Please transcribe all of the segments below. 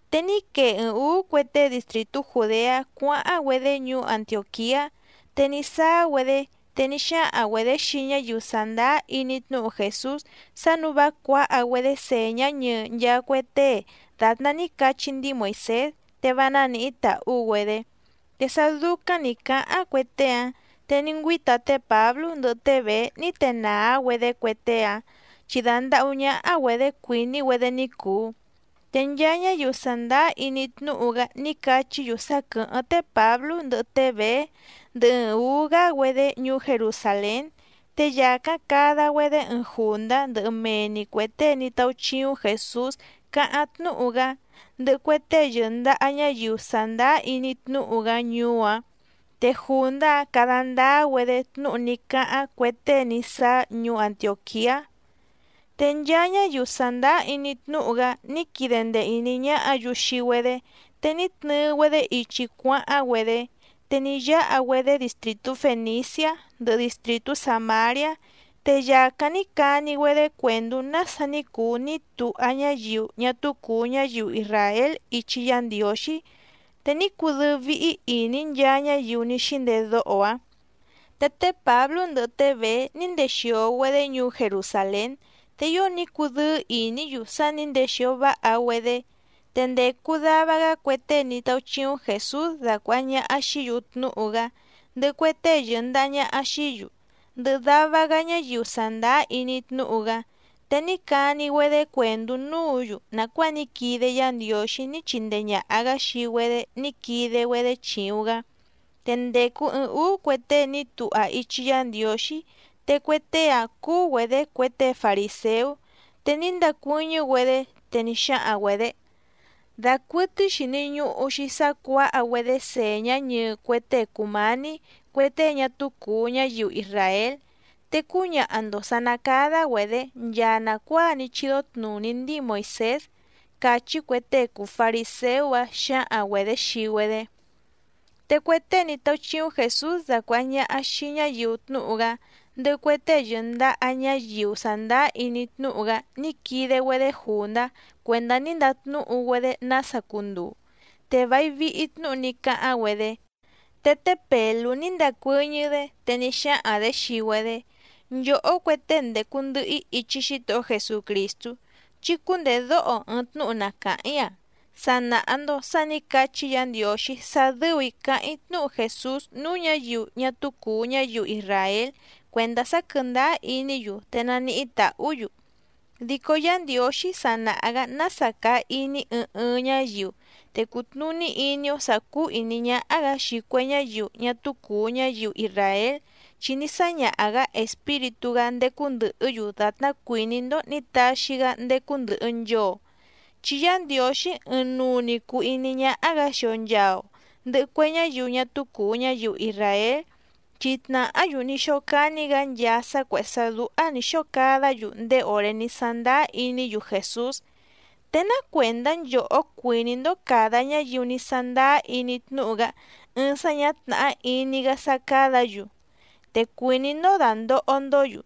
Te ní quee ɨɨⁿ ǔú cue tée distrìtú Jùdeá cuáháⁿ‑güedé ñuú Antiòquiá, te ní sáá‑güedé, te ní xáhaⁿ‑güedě xii ñáyiu sàndáá iní tnúhu Jèsús sá nǔu vá cuǎha‑güedé sèñá ñɨɨ nchaa cue tée dàtná ní cachí ndíi Moìsés, te vá nánǐhí tàhú‑güedé. Te sá dúcáⁿ nǐ cáháⁿ cue tée‑áⁿ, te ní ngüíta té Pǎblú ndɨhɨ té Bèé ní tenàá‑güedé cue tée‑áⁿ, chi dandàhú ñáhá‑güedě cuìní‑güedé ní cùu. Te nchaa ñáyiu sàndáá iní tnúhu‑gá ní cachí‑yu sá quɨ̀hɨ́ⁿ té Pǎblú ndɨhɨ té Bèé ndɨhɨ ɨɨⁿ ǔú‑gá‑güedé ñuú Jerusàlén. Te yàcáⁿ cada‑güedé ɨɨⁿ jùndá ndɨhɨ mee‑ni cuè tée ní táúchíúⁿ Jèsús càháⁿ tnúhu‑gá, ndɨhɨ cue tée yɨ̀ndaha ñáyiu sàndáá iní tnúhu‑gá ñuú‑áⁿ, te jùndá‑áⁿ cada ndáá‑güedé tnúhu ní cáháⁿ cue tée ní sáá ñuú Antiòquiá. Te nchaa ñáyiu sàndáá iní tnúhu‑gá ní quide ndee ìní ñáhǎ‑yu xii‑güedé, te ní tnɨɨ‑güedé ichi cuáháⁿ‑güedé. Te ní yáha‑güedé distrìtú Fèniciá ndɨhɨ distrìtú Sàmariá, te yàcáⁿ ní cani‑güedé cuèndú nása ní cuu ní tuha ñáyiu ñá túú cùu ñáyiu isràél ichi Yá Ndiǒxí, te ní cudɨ́ɨ́ víhí ìní nchaa ñáyiu ní xíndedóho‑áⁿ. Te té Pǎblú ndɨhɨ té Bèé ní ndexìo‑güedé ñuú Jerusàlén, te ío ní cudɨ́ɨ́ ìní‑yu sá nǐ ndexìo váha‑güedé. Te ndècu dava‑gá cue tée ní táúchíúⁿ Jèsús dácuàha ñaha xií‑yu tnúhu‑gá, ndɨhɨ cue tée yɨ̀ndaha ñaha xií‑yu, ndɨhɨ dava‑gá ñáyiu sàndáá iní tnúhu‑gá, te ní cani‑güedé cuèndú núǔ‑yu nàcuáa ní quide Yá Ndiǒxí ní chindee ñàha‑gá xii‑güedé ní quide‑güedé chìuⁿ‑gá. Te ndècu ɨɨⁿ úú cue tée ní tuha ichi Yá Ndiǒxí, te cue tée‑áⁿ cúú‑güedě cue tée farìséú, te ní ndacuɨ́ñɨ́‑güedé, te ní xáhaⁿ‑güedě: —Dacuɨtɨ́í xìni ñuhu‑xi sá cuǎha‑güedé sèñá ñɨɨ cue tée cùmání cue tée ñá túú cùu ñáyiu isràél, te cúñaha‑ndo sǎ ná cádá‑güedě nchaa nàcuáa ní chídó tnùní ndíi Moìsés —càchí cue tée cùu fariséú‑áⁿ xǎhaⁿ‑güedě xii‑güedé. Te cue tée ní táúchíúⁿ Jèsús dacuàha ñaha xii ñáyiu tnúhu‑gá, ndɨhɨ cue tée yɨ̀ndaha ñáyiu sàndáá iní tnúhu‑gá ní quide‑güedé jùndá cuèndá ní ndatnúhu‑güedé nása cunduu. Te vài vihi tnúhu ní cáháⁿ‑güedé. Te té Pèlú ní ndacuɨ́ñɨ́‑dé, te ní xáhaⁿ‑dě xii‑güedé: —Nchòhó cue tée ndècu ndɨhɨ‑í ichi Xítohó Jesucrìstú, chí cúndèdóho ɨɨⁿ tnúhu na càháⁿ‑í‑a. Sa nàha‑ndo sá nǐ cachí Yǎ Ndiǒxí sá dɨ́ù‑í cáháⁿ‑í tnúhu Jèsús núú ñǎyiu ñá túú cùu ñáyiu isràél cuèndá sá quɨ̀ndáá iní‑yu, te naníhí tàhú‑yu. Dico Yá Ndiǒxí sa nàha‑gá nása càa iní ɨɨⁿ ɨɨⁿ ñáyiu. Te cùtnuní iní‑ó sǎ cúú ìní ñáhá‑gǎ xii cue ñáyiu ñá túú cùu ñáyiu isràél, chi ní sáñaha‑gǎ Espíritú‑gá ndécú ndɨ̀hɨ́‑yu dàtná cuìní‑ndó nǐ taxi‑gá ndécú ndɨ̀hɨ nchoo. Chi Yá Ndiǒxí ɨɨⁿnuu‑ni cùu iní ñáhá‑gǎ xii‑o nchàa‑o ndɨhɨ cue ñáyiu ñá túú cùu ñáyiu isràél, chi tnàhá‑yu ní xócání‑gǎ nchaa sá cuèhé sá dúhá nǐ xóo cadá‑yu ndéé òré ní sándáá iní‑yu Jèsús. ¿Te ná cuèndá nchòhó cuìní‑ndó càda ñáyiu ní sándáá iní tnúhu‑gá ɨɨⁿ sá ñǎ tnàhá iní‑gá sá cádǎ‑yu? Te cuìní‑ndó dàndoho‑ndó‑yu.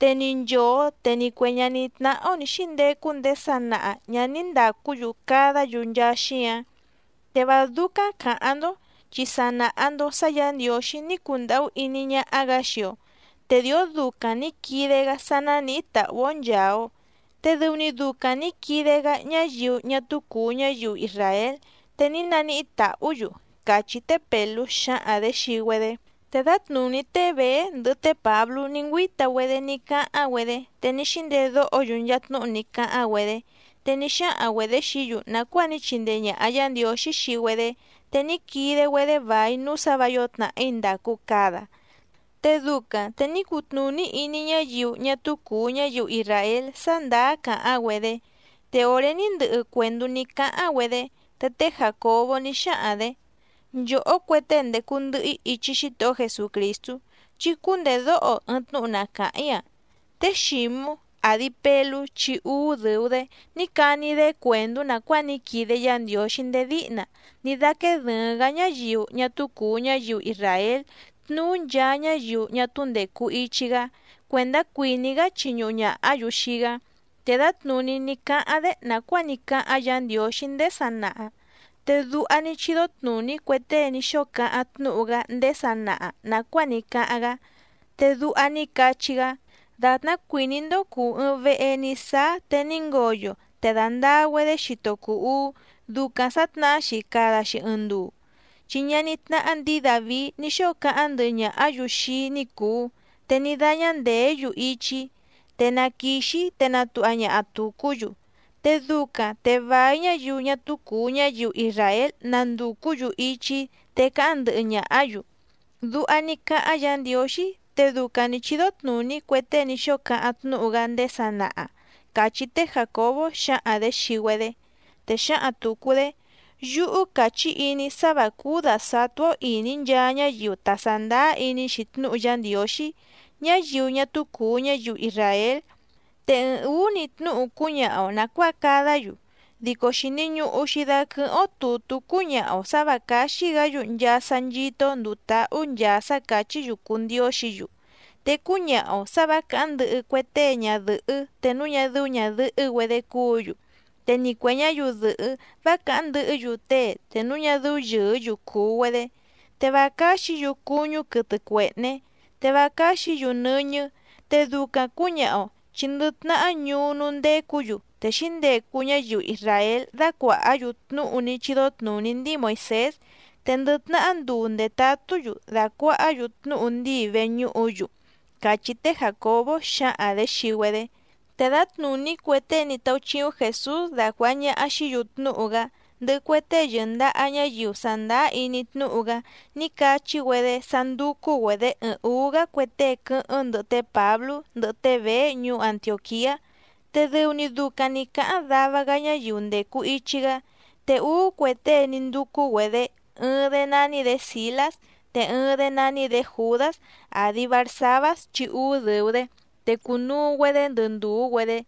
Te ni nchòo te ni cue ñaní tnáhá‑ó nǐ xíndecu ndéé sanaha ñǎ ní ndàcú‑yu cadá‑yu nchaa xíǎⁿ. Te vá dúcáⁿ cǎháⁿ‑ndó, chi sa nàha‑ndo sá Yǎ Ndiǒxí ní cundàhú iní ñáhá‑gǎ xii‑o, te dìó ducaⁿ nǐ quide‑gá sá nánìhí tàhú‑ó nchàa‑o. Te dɨu‑ni ducaⁿ nǐ quide‑gá ñáyiu ñá túú cùu ñáyiu isràél, te ní naníhí tàhú‑yu —càchí té Pèlú xǎhaⁿ‑dě xii‑güedé. Te dǎtnùní té Bèé ndɨhɨ té Pǎblú ní ngüíta‑güedé ní cáháⁿ‑güedé, te ní xíndedóho‑yu nchaa tnúhu ní cáháⁿ‑güedé. Te ní xáhaⁿ‑güedě xií‑yu nàcuáa ní chindee ñàha Yá Ndiǒxí xii‑güedé, te ní quide‑güedé vài núú sǎ vǎ yǒo tnàhí ndàcu cada, te ducaⁿ te ní cutnùní iní ñáyiu ñá túú cùu ñáyiu isràél sá ndàá càháⁿ‑güedé. Te òré ní ndɨhɨ cuèndú ní cáháⁿ‑güedé, te té Jàcobó ní xáhaⁿ‑dě: —Nchòhó cue tée ndècu ndɨhɨ‑í ichi Xítohó Jesucrìstú, chí cúndèdóho ɨɨⁿ tnúhu na càháⁿ‑í‑a. Té Xǐmú, àdi Pelú chi úú dɨ̀u‑dé, ní cani‑dé cuèndú nàcuáa ní quide Yá Ndiǒxí ndéé díhna ní dáquéé dɨ̀ɨⁿ‑gá ñáyiu ñá túú cùu ñáyiu isràél tnuú nchaa ñáyiu ñá túú ndècu ichi‑gá, cuèndá cuìní‑gá chiñuhu ñàhá‑yu xii‑gá. Te dǎtnùní ní cáháⁿ‑dé nàcuáa ní cáháⁿ Yǎ Ndiǒxí ndéé sanaha. Te duha ní chídó tnùní cue tée ní xóo cáháⁿ tnúhu‑gá ndéé sanaha nàcuáa ní cáháⁿ‑gá, te duha ní cachí‑gá: Dàtná cuìní‑ndó cùu ɨɨⁿ vehe ní sáá te ní ngoyo te dàndaa‑güedé xito cùu uú, ducaⁿ sǎtnahá‑xi cada‑xi ɨɨⁿ nduu, chi ñaní tnáhá ndǐi Dàvií ní xóo cáháⁿ ndɨhɨ ñàhá‑yu xii‑í ní cùu, te ní dáñá ndèé‑yu ichi‑í, te na quìxi‑í te natuha ñaha tùcú‑yu. Te ducaⁿ te vài ñáyiu ñá túú cùu ñáyiu isràél nandùcú‑yu ichi‑í te cáháⁿ ndɨhɨ ñàhá‑yu. Duha ní cáháⁿ Yǎ Ndiǒxí, te ducaⁿ nǐ chídó tnùní cue tée ní xóo cáháⁿ tnúhu‑gá ndéé sanaha —càchí té Jàcobó xǎhaⁿ‑dě xii‑güedé. Te xǎhaⁿ tùcu‑dé: —Yúhú càchí iní‑í sá vǎ cúú dàsatú‑ó ìní nchaa ñáyiu ta sàndáá iní‑xi tnúhu Yá Ndiǒxí, ñáyiu ñá túú cùu ñáyiu isràél, te ɨɨⁿ ǔú‑ni tnúhu cúñaha‑o nàcuáa cadá‑yu. Dico xìni ñuhu‑xi daquɨhɨ́ⁿ‑ó tùtú cúñaha‑o sǎ vǎ cáxí‑gǎ‑yu nchaa sá nchító‑ó ndùu táhú nchaa sá càchí‑yu cùu ndióxǐ‑yu. Te cúñaha‑o sǎ vǎ càháⁿ ndɨhɨ cue tée ñadɨ̀hɨ́ te núu ñá dɨ́ú ñàdɨhɨ́‑güedé cúǔ‑yu, te ni cuè ñáyiu dɨ̀hɨ́ vá càháⁿ ndɨhɨ́‑yu tée te núu ñá dɨ́ú yɨ̀ɨ́‑yu cùu‑güedé, te vá cáxǐ‑yu cuñú quɨtɨ cuèhné, te vá cáxǐ‑yu nɨ́ñɨ́. Te ducaⁿ cǔñaha‑o, chi ndɨ tnahá ñuú núú ndécǔ‑yu, te xǐndecu ñáyiu isràél dácuàhá‑yu tnúhu ní chídó tnùní ndíi Moìsés, te ndɨ tnahá nduu ndètatú‑yu dàcuahá‑yu tnúhu ndíi veñúhu‑yu —càchí té Jàcobó xǎhaⁿ‑dě xii‑güedé. Te dǎtnùní cue tée ní táúchíúⁿ Jèsús dacuàha ñaha xií‑yu tnúhu‑gá, ndɨhɨ cue tée yɨ̀ndaha ñáyiu sàndáá iní tnúhu‑gá ní cachí‑güedé sá ndúcú‑güedě ɨɨⁿ ǔú‑gá cue tée quɨ́hɨ́ⁿ ndɨhɨ té Pǎblú ndɨhɨ té Bèé ñuú Antiòquiá, te dɨu‑ni ducaⁿ nǐ cáháⁿ dava‑gá ñáyiu ndècu ichi‑gá. Te úú cue tée ní ndúcú‑güedě, ɨɨⁿ‑dé nání‑dě Sìlás, te ɨɨⁿ‑dé nání‑dě Jùdás, àdi Barsabás chi úú dɨ̀u‑dé, te cùnuu‑güedé ndɨ ndùú‑güedé.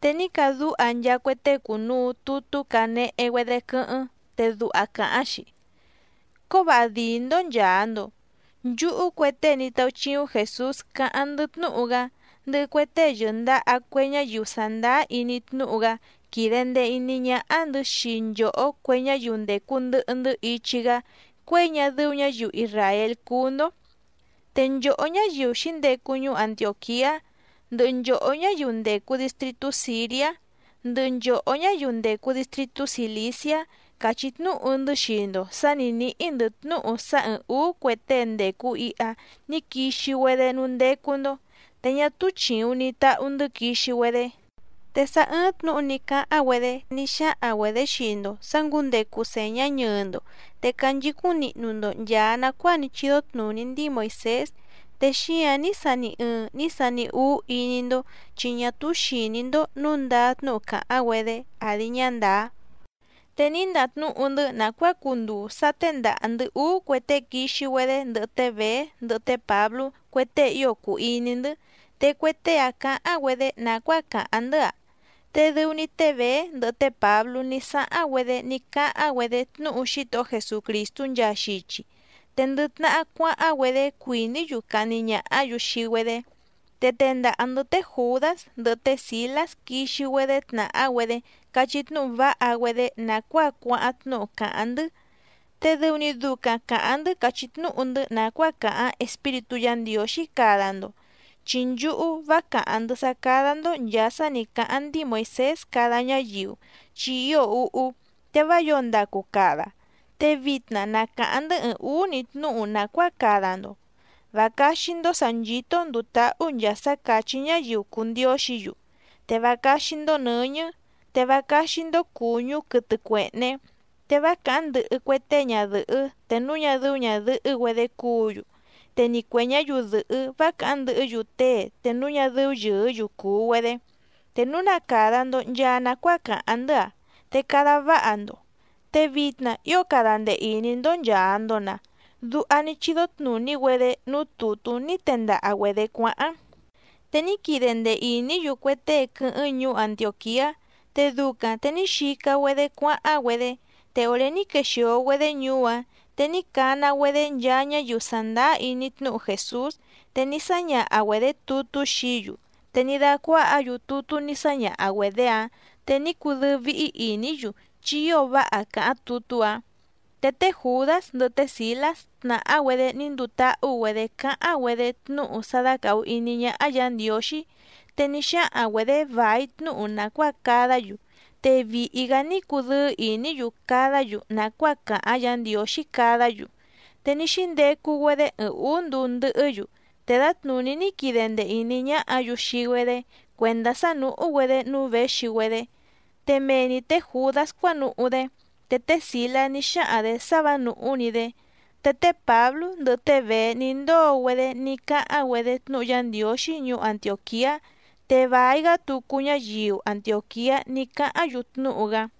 Te ní cadúha nchaa cue tée cùnuu tutú canehe‑güedé quɨ́hɨ́ⁿ, te duha càháⁿ‑xi: “Cóvǎha dǐí‑ndó nchàa‑ndo. Nchúhú cue tée ní táúchíúⁿ Jèsús cáháⁿ‑ndɨ́ tnúhu‑gá, ndɨhɨ cue tée yɨ̀ndaha cue ñáyiu sàndáá iní tnúhu‑gá quìde ndee iní ñáhá‑ndɨ̌ xii nchòhó cue ñáyiu ndècu ndɨhɨ‑ndɨ́ ichi‑gá cuěi ñá dɨ́ú ñǎyiu isràél cúú‑ndó. Te nchòhó ñáyiu xǐndecu ñuú Antiòquiá, ndɨhɨ nchòhó ñáyiu ndècu distritú Sìriá, ndɨhɨ nchòhó ñáyiu ndècu distritú Cìliciá, càchí tnúhu‑ndɨ́ xii‑ndo sǎ nǐ níhí‑ndɨ̌ tnúhu sá ɨ̀ɨⁿ úú cue tée ndècu iha ní quixi‑güedé núú ndécú‑ndó, te ñá túú chìuⁿ ni tahu‑ndɨ́ quixi‑güedé. Te sá ɨ́ɨ́ⁿ tnǔhu ní cáháⁿ‑güedé ní xáhaⁿ‑güedě xii‑ndo sǎ ngǔndecu sèñá ñɨɨ‑ndo, te canchicúⁿ nihnu‑ndo nchàa nacuáa ní chídó tnùní ndíi Moìsés, te xíǎⁿ ní sani ɨɨⁿ ní sani úú iní‑ndó, chi ñá túú xìní‑ndó nǔu ndáá tnúhu càháⁿ‑güedé àdi ñá ndàá. Te ní ndatnúhu‑ndɨ́ nàcuáa cunduu sá téndàha‑ndɨ́ úú cue tée quixi‑güedé ndɨhɨ té Bèé ndɨhɨ té Pǎblú, cue tée ío cùu iní‑ndɨ́, te cue tée‑áⁿ cǎháⁿ‑güedé nàcuáa càháⁿ‑ndɨ́‑a. Te dɨu‑ni té Bèé ndɨhɨ té Pǎblú ní sáháⁿ‑güedé ní cáháⁿ‑güedé tnúhu Xítohó Jesucrìstú nchaa xichi. Te ndɨ tnahá cuáháⁿ‑güedé cuìní‑yu cahni ñàhá‑yu xii‑güedé. Te tendaha‑ndɨ̌ té Jùdás ndɨhɨ té Sìlás quixi‑güedé tnàhá‑güedé cachí tnúhu váha‑güedé nàcuáa cuáháⁿ tnúhu càháⁿ‑ndɨ́. Te dɨu‑ni ducaⁿ càháⁿ‑ndɨ́ càchí tnúhu‑ndɨ́ nàcuáa càháⁿ Espíritú Yǎ Ndiǒxí cada‑ndo, chi nchúhú vá càháⁿ‑ndɨ́ sá cádá‑ndó nchàa sá nǐ cáháⁿ ndíi Moìsés cada ñáyiu, chi ío úhú, te vá yǒo ndacu cada. Te vitna na càháⁿ‑ndɨ́ ɨɨⁿ ǔú‑ni tnúhu nàcuáa cada‑ndo. Vá cáxí‑ndó sǎ nchító‑ó ndùu táhú nchaa sá càchí ñáyiu cùu ndióxǐ‑yu, te vá cáxí‑ndó nɨ̌ñɨ́, te vá cáxí‑ndó cùñú quɨtɨ cuèhné, te vá càháⁿ ndɨhɨ cue tée ñadɨ̀hɨ́ te núu ñá dɨ́ú ñàdɨhɨ́‑güedé cúǔ‑yu, te ni cuè ñáyiu dɨ̀hɨ́ vá càháⁿ ndɨhɨ́‑yu tée te núu ñá dɨ́ú yɨ̀ɨ́‑yu cùu‑güedé. Te núu na càda‑ndo nchaa nacuáa càháⁿ‑ndɨ́‑a, te cada váha‑ndo. Te vitna ío cada ndee ìní‑ndó nchàa‑ndo‑na.” Duha ní chídó tnùní‑güedé núú tùtú ní tendaha‑güedě cuáháⁿ. Te ní quide ndee ìní‑yu cue tée quɨ́hɨ́ⁿ ñuú Antiòquiá, te ducaⁿ te ní xica‑güedé cuáháⁿ‑güedé. Te òré ní quexìo‑güedé ñuú‑áⁿ, te ní cana‑güedé nchaa ñáyiu sàndáá iní tnúhu Jèsús, te ní sáñaha‑güedě tutú xií‑yu. Te ní dácuáhǎ‑yu tutú ní sáñaha‑güedě‑áⁿ, te ní cudɨ́ɨ́ víhí ìní‑yu chi ío váha càháⁿ tutú‑áⁿ. Te té Jùdás ndɨhɨ té Sìlás tnàhá‑güedé ní nduu táhú‑güedě cáháⁿ‑güedé tnúhu sá dácàhu iní ñáhá Yǎ Ndiǒxí. Te ní xáhaⁿ‑güedě vài tnúhu nàcuáa cadá‑yu, te vìhi‑gá ní cudɨ́ɨ́ ìní‑yu cadá‑yu nàcuáa càháⁿ Yǎ Ndiǒxí cadá‑yu. Te ní xíndecu‑güedé ɨɨⁿ ǔú nduu ndɨhɨ́‑yu, te dǎtnùní ní quide ndee ìní ñáhǎ‑yu xii‑güedé cuèndá sá nùhú‑güedé núú věxi‑güedé, te mee‑ni tě Jùdás cuánuhú‑dé. Te té Sìlás ní xáhaⁿ‑dě sá vǎ nùhú‑ni‑dé. Te té Pǎblú ndɨhɨ té Bèé ní ndóo‑güedé ní cáháⁿ‑güedé tnúhu Yá Ndiǒxí ñuú Antiòquiá, te vài‑gá tucu ñáyiu Antiòquiá ní cáháⁿ‑yu tnúhu‑gá.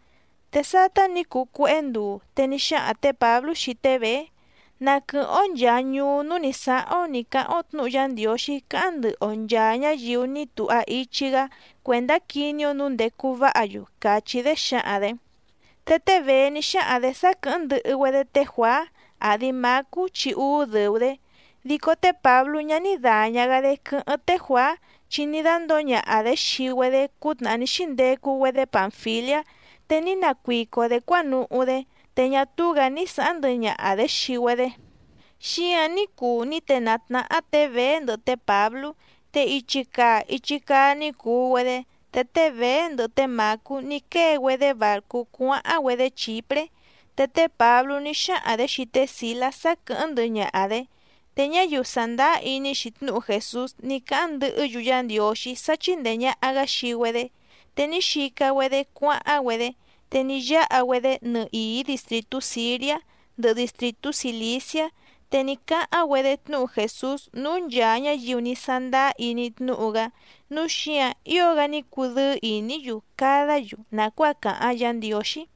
Te sátá nǐ cuu cuéhé nduu, te ní xáhaⁿ tě Pǎblú xii té Bèé: —Na quɨ̀hɨ́ⁿ‑ó nchàa ñuú núú nǐ sáháⁿ‑ó nǐ cáháⁿ‑ó tnǔhu Yá Ndiǒxí cáháⁿ ndɨhɨ‑o nchàa ñáyiu ní tuha ichi‑gá cuèndá quiní‑ó nǔu ndècu váha‑yu —càchí‑dé xǎhaⁿ‑dě. Te té Bèé ní xáhaⁿ‑dě sá quɨ̀hɨ́ⁿ ndɨhɨ‑güedé té Juàá, àdi Mácú chi úú dɨ̀u‑dé. Dico té Pǎblú ñá ní dàña‑gá‑dé quɨ́hɨ́ⁿ té Juàá, chi ní dándǒo ñaha‑dě xii‑güedé cútnàhá ní xíndecu‑güedé Pànfiliá, te ní nacuico‑dě cuánuhú‑dé, te ñá túú‑gǎ ní sǎháⁿ ndɨhɨ ñaha‑dě xii‑güedé. Xíǎⁿ ní cuu ní tenàá tnáhá tě Bèé ndɨhɨ té Pǎblú, te ichi càa ichi caa ní cuu‑güedé. Te té Bèé ndɨhɨ té Mǎcú ní quée‑güedé bàrcú cuáháⁿ‑güedé Chìpré. Te té Pǎblú ní xáhaⁿ‑dě xii té Sìlás sá quɨ̀hɨ́ⁿ ndɨhɨ ñaha‑dě, te ñáyiu sàndáá iní‑xi tnúhu Jèsús ní cáháⁿ ndɨhɨ́‑yu Yá Ndiǒxí sá chíndèe ñaha‑gá xii‑güedé. Te ní xica‑güedé cuáháⁿ‑güedé te ní yáha‑güedé nɨhìí distrìtú Sìriá ndɨhɨ distrìtú Cìliciá. Te ní cáháⁿ‑güedé tnúhu Jèsús núú nchàa ñáyiu ní sándáá iní tnúhu‑gá, núu xíǎⁿ ío‑gá ní cudɨ́ɨ́ ìní‑yu cadá‑yu nàcuáa càháⁿ Yǎ Ndiǒxí.